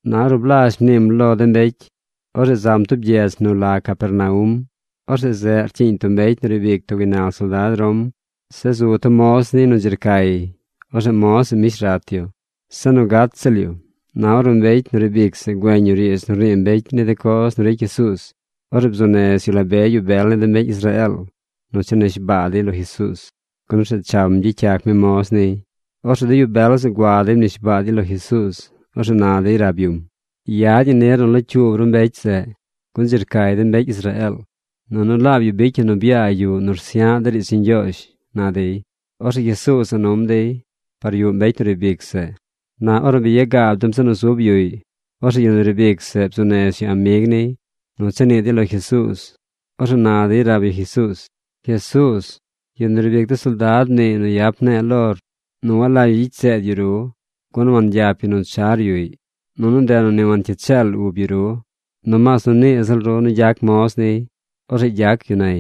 Na ornu blazh mniim lo de mbecy, orzeꞌ zam tub gyedz nu la Capernaum. Orzeꞌ zeꞌ rcyiiñ tub mbecy nu riib ic tub gaynal soldad Rom. Zeꞌ zu tub moz niy nu dzi rcay. Orzeꞌ moz zeꞌ mbish rat yu. Se nu gat ziꞌl yu. Na ornu mbecy nu riib ic zeꞌ güeñ yu riidz nu rnii mbecy ni de coz nu ricy Jesuuz, orzeꞌ bzuu nez yu la be yu bel ni de mbecy Israeel nu cha nishbaa dey lo Jesuuz, gun orzeꞌ cham gyicy yac mi moz niy. Orzeꞌ de yu bel zeꞌ gua dey mnishbaa dey lo Jesuuz. Orzeꞌ na dey rab yum: ―Yad ñi nir nu locyuub ru mbecy zeꞌ, gun dzi rcay de mbecy Israeel. Nunu laab yu bicy yu nu byaa yuꞌ nu rsya̱ꞌ de̱ riidz ni Ñgyoozh ―na dey. Orzeꞌ Jesuuz za num dey par yuꞌ mbecy nu riib ic zeꞌ. Na ornu bi ya gaab dem zeꞌ nu zub yuꞌy, orzeꞌ yu nu riib ic zeꞌ bzuu nez yu amig niy nu cha nii dey lo Jesuuz. Orzeꞌ na dey rab yu Jesuuz: ―Jesuuz, yu nu riib ic de soldad mniiy nu yap ne̱e̱ lor nu walagy yu gyicy seed yu ru, gun wangyap yu nu char yuꞌy. Nunu ndeꞌ nu ni wancyiid cheel ub yu ru. Nomaas nu nii ziꞌl ru nu gyac moz niy. Orzeꞌ gyac yu nay.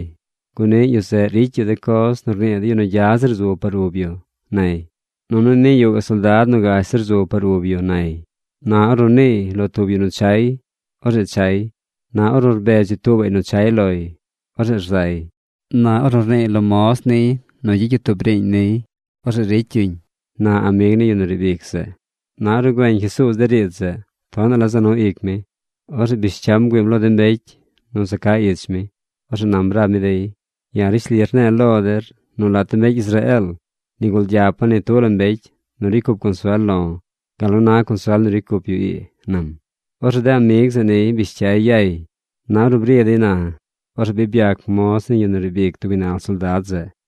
Gun niꞌ yu zeꞌ ricy yu de coz nu rnii de yu nu gya zir zu par ub yu, nay. Nunu niꞌ yuꞌ gaꞌ soldad nu gash zir zu par ub yu, nay. Na ornu niiy lo tub yu nu chay, orzeꞌ chay. Na ornu rbedz yu tuubaꞌy nu chay loy, orzeꞌ rzay. Na ornu rniiy lo moz niy nu gyicy yu tub riiñ niy, orzeꞌ ricy yuñ ―na amig ni yu nu riib ic zeꞌ. Na ornu güeñ Jesuuz de riidz zeꞌ, tonaꞌ la za nu ic mi. Orzeꞌ bish cyam bgüiim lo de mbecy nu za ca ich mi. Orzeꞌ nam rab mi dey: ―Ya̱ rishli rne̱e̱ lo der nu lat de mbecy Israeel nigul gyapa̱ ni tub la mbecy nu ricy cup consuel lo̱ gal nu na consuel nu ricy cup yu ii ―nam. Orzeꞌ de amig zeꞌ niy bish cyay yay. Na ornu bri dey na, orzeꞌ bi byac moz ni yu nu riib ic tub gaynal soldad zeꞌ.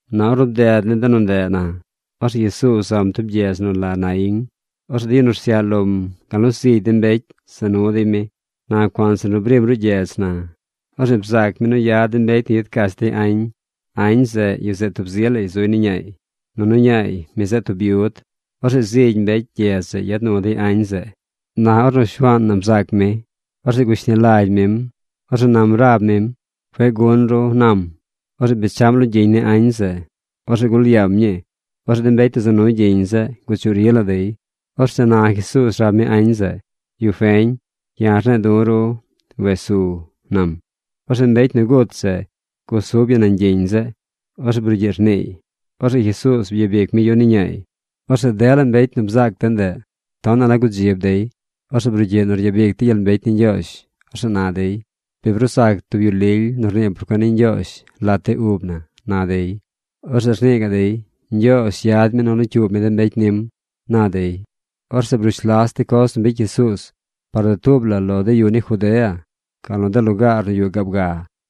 Na ornu bded de nu ndeꞌ na, orzeꞌ Jesuuz zam tub gyedz nu la Naíñ. Orzeꞌ de yu nu rsyaꞌ lom, gal nu zigy de mbecy za nu dey mi. Na cuanzir nu brim ruꞌ gyedz na, orzeꞌ bzaac mi nu yad de mbecy nu yad cach dey añ. Añ zeꞌ, yu zeꞌ tub zi lay zuy ni ñaay. Nunu ñaay, mi zeꞌ tub byud. Orzeꞌ zigy mbecy gyedz zeꞌ yad nu dey añ zeꞌ. Na ornu Shuaan na bzaac mi, orzeꞌ gushni lagy mim. Orzeꞌ nam rab mim: ―Cueꞌ gun ru ―nam. Orzeꞌ bechaꞌm lo gyiñ ni añ zeꞌ. Orzeꞌ gul yaam ñii. Orzeꞌ de mbecy nu za nu gyiñ zeꞌ guchuꞌ ri la dey. Orzeꞌ na Jesuuz rab mi añ zeꞌ: ―Yu feñ, ya̱ rne̱e̱ du̱ ru: “¡Wes su!” ―nam. Orzeꞌ mbecy nu gut zeꞌ gusub yu nañ gyiñ zeꞌ. Orzeꞌ brugyiꞌ rniiy. Orzeꞌ Jesuuz byabic mi yu ni ñaay. Orzeꞌ dela mbecy nu bzaac de ndeꞌ tonaꞌ la gudzib dey. Orzeꞌ brugyiꞌ nu ryabic dey gyel mbecy ni Ñgyoozh. Orzeꞌ na dey: ―Bi bruu zac tub yu lily nu rnii por cuen ni Ñgyoozh lat de ub na ―na dey. Orzeꞌ rnii gaꞌ dey: ―Ñgyoozh yad mi nu locyuub mi de mbecy nim ―na dey. Orzeꞌ brush las de coz nu bicy Jesuuz par dutuub la lo de yu ni Judea gal nu de lugaar nu yuꞌ gaab ga.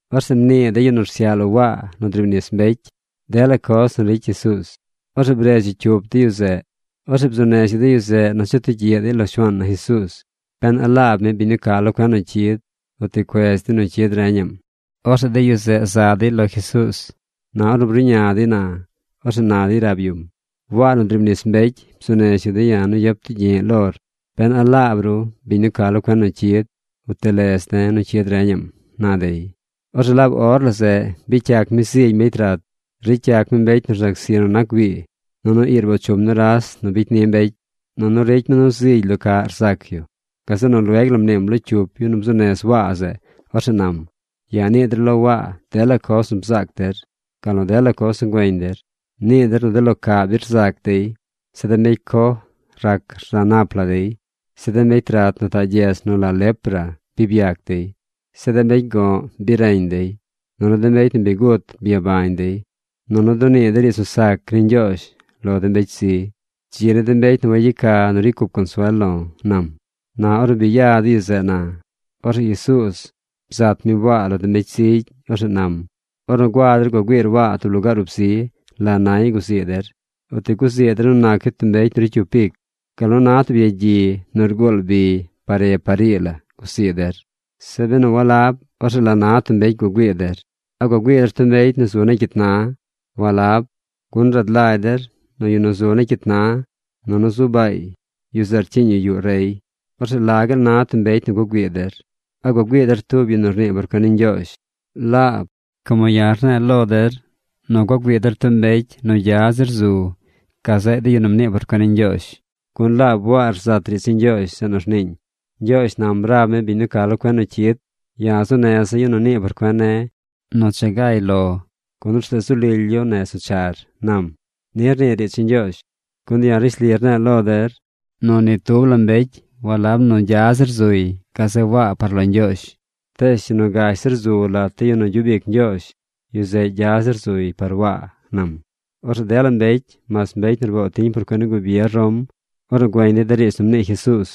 Orzeꞌ mnii de yu nu rsyaꞌ lo Waa nu driib nis mbecy dela coz nu ricy Jesuuz. Orzeꞌ bredz yu cyup de yu zeꞌ. Orzeꞌ bzuu nez yu de yu zeꞌ nu cha tugyiꞌ dey lo Shuaan na Jesuuz ben a laab mi biñ nu ca lo cuen nu cyid, o ti cuez dey nu cyid reñaꞌm. Orzeꞌ de yu zeꞌ za dey lo Jesuuz. Na ornu bruꞌña dey na, orzeꞌ na dey rab yum: ―Waa nu driib nis mbecy bzuu nez yu de̱ ya̱ nu yap tugyi̱ꞌ lor ben a laab ru biñ nu ca lo cuen nu cyid, o ti lez de̱ nu cyid reñaꞌm ―na dey. Orzeꞌ laab or la zeꞌ bicy yac mi zigy mbecy rat. Ricy yac mi mbecy nu rzac zi nu nac güii. Nunu ii rboo chum nuras nu bicy ni mbecy. Nunu ricy mi nu zigy lo caꞌ rzac yu. Gazeꞌ nu lueg la mniim lo cyup yu nu bzuu nez Waa zeꞌ. Orzeꞌ nam: ―Yaa nii der lo Waa dela coz nu bzaac der, gal nu dela coz nu güeñ der. Nii der nu de lo caꞌ bi rzac dey. Zeꞌ de mbecy coj rac rza nap la dey. Zeꞌ de mbecy rat nu taꞌ gyedz nu la lepra bi byac dey. Zeꞌ de mbecy go̱ꞌ bi reñ dey. Nunu de mbecy nu bi gut byabañ dey. Nunu dunii de riidz nu sac ni Ñgyoozh lo de mbecy zi. Dzi ni mbecy nu wayeca nu ricy cup consuel lo̱ ―nam. Na ornu bi ya de yu zeꞌ na, orzeꞌ Jesuuz bzat mi Waa lo de mbecy zigy. Orzeꞌ nam: ―Ornu gua der gua güiir Waa tub lugaar ub zi, ¿la nay guzii der? ¿O ti guzii der nu nac yu mbecy nu ricy cyup ic, gal nu na tub yagyi nu rguul bi par re par ii la guzii der? Zeꞌ benu walab, orzeꞌ ¿la na tub mbecy gua güii der? ¿A gua güii der tub mbecy nu zu negy cyit na? Walab, gun rad lagy der nu yu nu zu negy cyit na, nunu zu baay, yu zeꞌ rcyiiñ yu yuꞌ rey. ¿Orzeꞌ la gaal na tub mbecy nu gua güii der? ¿A gua güii der tub yu nu rnii por cuen ni Ñgyoozh? Laab, como ya̱ rne̱e̱ lo der nu gua güii der tub mbecy nu zily zir nac gazeꞌ de yu nu mnii por cuen ni Ñgyoozh. Gun laab Waa rzat riidz ni Ñgyoozh zeꞌ nu rniiñ: Ñgyoozh nam rab mi biñ nu ca lo cuen nu cyid: Ya̱ zuu neza̱ yu nu nii por cuen ne̱ nu cha gay lor, gun orzeꞌ zu lily yu nez nu char, nam. Ni rnii riidz ni Ñgyoozh. Gun ya̱ rishli rne̱e̱ lo der nu ni tub la mbecy a̱ꞌ zily zir nac yu gazeꞌ Waa par lo Ñgyoozh. Tees yu nu gash zir zu lat de yu nu gyub ic Ñgyoozh, yu zeꞌ gya zir zuy par Waa ―nam. Orzeꞌ dela mbecy mas mbecy nu rboo tiñ por cuen ni gubier Rom, ornu güeñ dey de riidz nu mnii Jesuuz,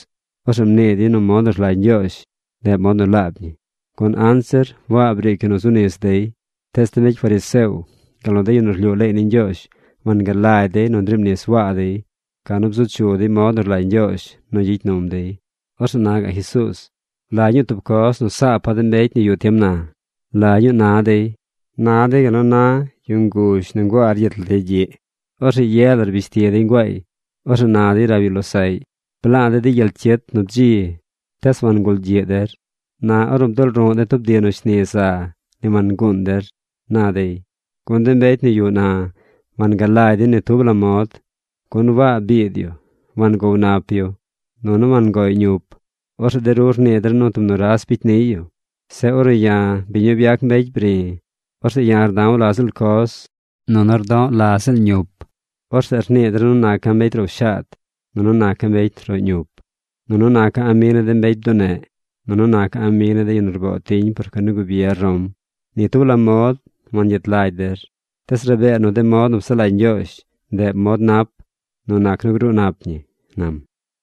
orzeꞌ mnii dey nu mod nu rlagy Ñgyoozh, ndeꞌ mod nu laab ñi. Gun anzir Waa briic yu nu zu nis dey. Tees de mbecy Fariseo, gal nu de yu nu rlyuu leey ni Ñgyoozh, wangalagy dey nu ndriib nis Waa dey, ca nu bzu chu dey mod nu rlagy Ñgyoozh nu gyicy num dey. Orzeꞌ na gaꞌ Jesuuz: ―¿La ñuu tub coz nu saapa̱ de mbecy nu yuꞌ tiem na? ¿La ñuu na dey? Na dey gal nu na yu nguzh nu nguaa rgyit lat yagyiꞌ. Orzeꞌ ye la rbish ti dey nguaay. Orzeꞌ na dey rab yu losaꞌy: “Bla̱a̱ de̱ di gyel cyit nu bdzi. Tees wangulgyiꞌ der. Na ornu bdulruꞌ de̱ tub di nu shni za, ni wanguun der”, na dey. Gun de mbecy nu yuꞌ na wangalagy dey ni tub la mod. Gun Waa biid yu wangow nap yu. Nunu wangoꞌy ñup. Orzeꞌ de ru rnii der nu tub nuras bicy niy yu. Zeꞌ ornu ya̱, biñ nu byac mbecy bri̱, orzeꞌ ya̱ rda̱w la ziꞌl coz, nunu rdo̱ꞌ la ziꞌl ñup. Orzeꞌ rnii der nu naca̱ mbecy row shaad, nunu naca̱ mbecy roꞌ ñup, nunu naca̱ amig ni de mbecy bduneꞌ, nunu naca̱ amig ni de yu nu rboo tiñ por cuen ni gubier Rom. Ni tub la mod wangyet lagy der. Tees rabee nu de mod nu psaꞌ lagy Ñgyoozh, ndeꞌ mod nap, nu nac nu gruu nap ñi ―nam.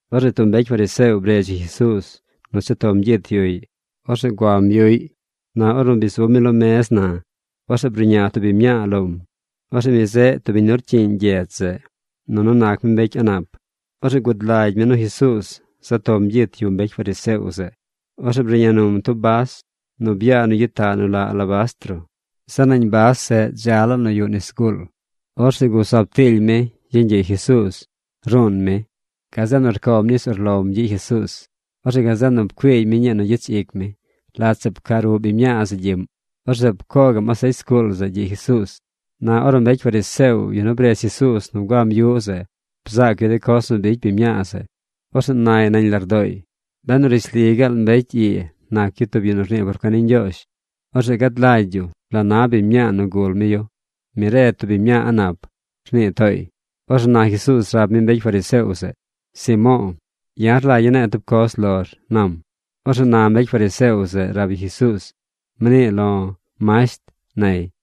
Orzeꞌ tub mbecy fariseo bredz yu Jesuuz nu cha tom gyit yuꞌy. Orzeꞌ guam yuꞌy. Na ornu bi zub mi lo mez na, orzeꞌ bruꞌña tub biñ mñaa lom. Orzeꞌ mi zeꞌ tub biñ nu rcyiiñ gyedz zeꞌ, nunu nac mi mbecy a̱ꞌ nap. Orzeꞌ gud lagy mi nu Jesuuz za tom gyit yuꞌ mbecy fariseo zeꞌ. Orzeꞌ bruꞌña num tub bas nu byaa nu gyitaꞌ nu la alabastro. Zeꞌ nañ bas zeꞌ dza laa nu yuꞌ nis zguul. Orzeꞌ gusub tiily mi yeñ gyiꞌ Jesuuz. Ruun mi. Gazeꞌ nu rcoom nis urlom gyiꞌ Jesuuz. Orzeꞌ gazeꞌ nu rcuiigy mi ñii nu gyich ic mi. Lat zeꞌ pca ruꞌ biñ mñaa zeꞌ gyiꞌm. Orzeꞌ pcoo gaꞌm asecy zguul zeꞌ gyiꞌ Jesuuz. Na ornu mbecy fariseo, yu nu bredz Jesuuz nu guam yuꞌ zeꞌ, bzaac yu de coz nu bicy biñ mñaa zeꞌ, orzeꞌ nay nañ lardooy: “Benu rishli gaal mbecy ii nac yu tub yu nu rnii por cuen ni Ñgyoozh, orzeꞌ gad lagy yu la na biñ mñaa nu gul mi yu. Mi re tub biñ mñaa a̱ꞌ nap”, rnii tooy. Orzeꞌ na Jesuuz rab mi mbecy fariseo zeꞌ: ―Simo̱o̱, ya̱ rlagya̱ ne̱e̱ tub coz lor ―nam. Orzeꞌ na mbecy fariseo zeꞌ rab yu Jesuuz: ―Mnii lo̱, masht ―nay.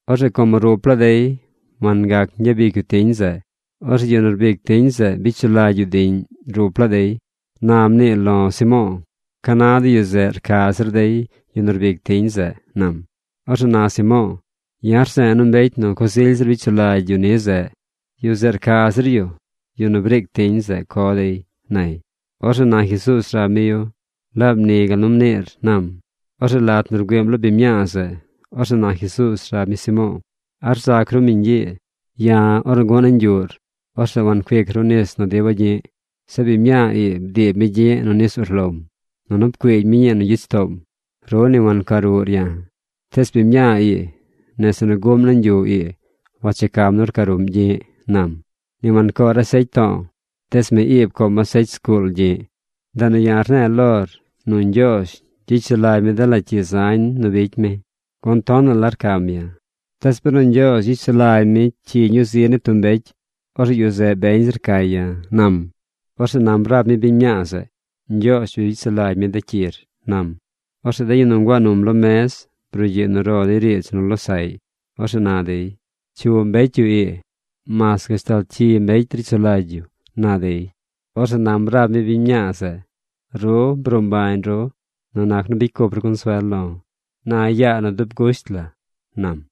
Orzeꞌ como rup laa dey wangac gyabic yu tiñ zeꞌ, orzeꞌ yu nu rbic tiñ zeꞌ bicy sulagy yu diꞌñ rup laa dey. Na mnii lo̱ Simo̱o̱: ¿ca na de yu zeꞌ rca zir dey yu nu rbic tiñ zeꞌ? ―nam. Orzeꞌ na Simo̱o̱: ―Ya̱ rze̱e̱ nu mbecy nu coz ily zir bicy sulagy yu ni zeꞌ, yu zeꞌ rca zir yu yu nu briic tiñ zeꞌ co dey ―nay. Orzeꞌ na Jesuuz rab mi yu: ―Laab ni gal nu mniir ―nam. Orzeꞌ lat nu rgüiim lo biñ mñaa zeꞌ, orzeꞌ na Jesuuz rab mi Simo̱o̱: ―¿A rzac ru biñ ii? Ya̱, ornu gu̱ꞌ nañ yuꞌr, orzeꞌ wancuic ru nis nu diba̱ gyi̱ꞌ. Zeꞌ biñ mñaa ii bdiib mi gyi̱ꞌ nu nis urlom, nunu pcuiigy mi ñii nu gyich toom. Ru ni wanca ruꞌr ya̱, tees biñ mñaa ii nese nu guꞌm nañ yuꞌ ii wanchecam nu rca ruꞌm gyi̱ꞌ ―nam―. ’Ni wancoor asecy to̱o̱, tees mi ii pcoom asecy zguul gyi̱ꞌ. Ndeꞌ nu ya̱ rne̱e̱ lor nu Ñgyoozh gyicy sulagy mi dela cyi zañ nu bicy mi, gun tonaꞌ la rcam ya̱. Tees benu Ñgyoozh gyicy sulagy mi de cyi ñuu zi ni tub mbecy, orzeꞌ yu zeꞌ beñ zi rcay ya̱ ―nam. Orzeꞌ nam rab mi biñ mñaa zeꞌ: ―Ñgyoozh bi bicy sulagy mi de cyir ―nam. Orzeꞌ de yu nu nguaa num lo mez brugyiꞌ nu ro dey riidz nu losaꞌy. Orzeꞌ na dey: ―¿Cyu mbecy yu ii? Mas gashtal cyi mbecy ricy sulagy yu ―na dey. Orzeꞌ nam rab mi biñ mñaa zeꞌ: ―Ru bruu mbañ ru nu nac nu bicy cup ru consuel lo̱. Na yaa nu dub gusht la ―nam.